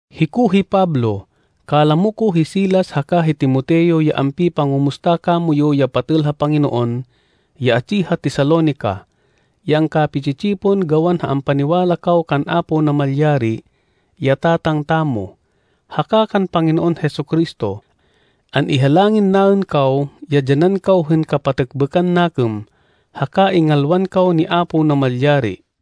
Hiko hi Pablo, kalamo ko hi Silas haka hi Timoteo ya ampipangumusta kamoyu ya patêl ha Panginoon ya atsi ha Tesalonica, ya angkapi-tsi-tsipon gawan ha ampaniwala kaw kan Apo Namalyari, ya Tatang tamo, haka kan Panginoon Jesu-Cristo. An-ihalangin naên kaw ya dyanan kaw hên kapatêkbêkan nakêm, haka ingalwan kaw ni Apo Namalyari.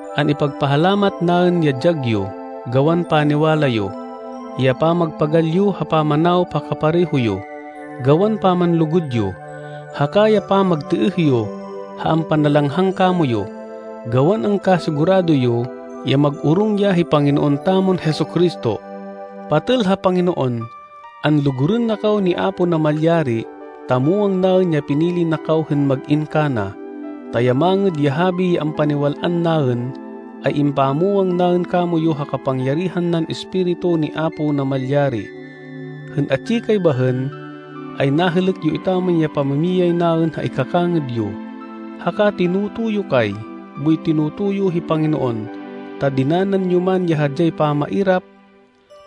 An-ipagpahalamat naên ya dyag yo, gawan paniwala yo, ya pamagpagal yo ha pamanawop ha kapareho yo, gawan pamanlugud yo, haka ya pamagtêêh yo ha ampanalanghang kamoyu, gawan angkasigurado yo ya mag-orong ya hi Panginoon tamon Jesu-Cristo. Patêl ha Panginoon, anlugurên na kaw ni Apo Namalyari, ta muwang naên ya pinili na kaw hên mag-in kana, ta ya Mangêd ya Habi ya ampaniwal-an naên, ay impamwang naên kamoyu ha kapangyarihan nan Espiritu ni Apo Namalyari. Hên atsi kay bahên, ay nahêlêk yo etaman ya pamimiyay naên ha ikakangêd yo. Haka tinoto yo kay boy tinoto yo hi Panginoon. Ta dinanan yo man ya hadyay pamairap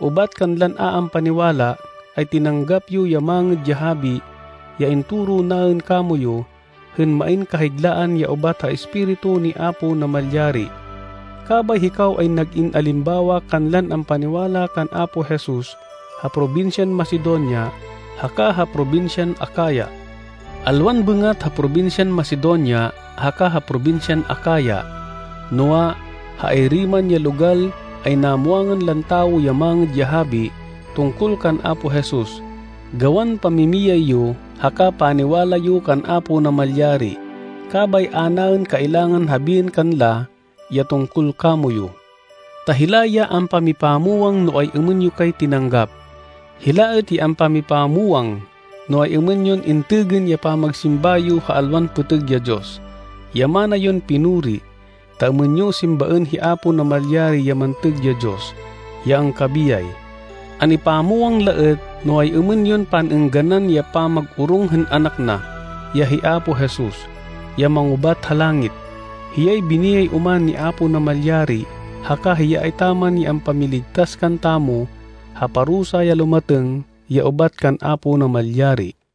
ubat kanlan a ampaniwala, ay tinanggap yo ya Mangêd ya Habi ya intoro naên kamoyu hên main kahiglaan ya ubat ha Espiritu ni Apo Namalyari. Kabay hikaw ay nag-in alimbawa kanlan ampaniwala kan Apo Jesus ha probinsyan Macedonia haka ha probinsyan Acaya. Alwan bêngat ha probinsyan Macedonia haka ha probinsyan Acaya, noa, ha ayri man ya logal ay namwangan lan tawo ya Mangêd ya Habi tungkol kan Apo Jesus gawan pamimiyay yo haka paniwala yo kan Apo Namalyari. Kabay a naên kailangan habiên kanla ya tungkol kamoyu. Ta hila ya ampamipamwang no ay-êmên yo kay tinanggap. Hila êt ya ampamipamwang no ay-êmên yon intêgên ya pamagsimba yo ha alwan pêtêg ya diyos, ya mana yon pinuri, ta êmên yo simbaên hi Apo Namalyari ya mantêg ya Diyos, ya angkabiyay. An-ipamwang la êt no ay-êmên yon pan-êngganan ya pamag-orong hên anak na, ya hi Apo Jesus, ya mangubat ha langit. Hiyay biniyay oman ni Apo Namalyari haka hiya etaman ya ampamiligtas kantamo ha parusa ya lumatêng ya ubat kan Apo Namalyari.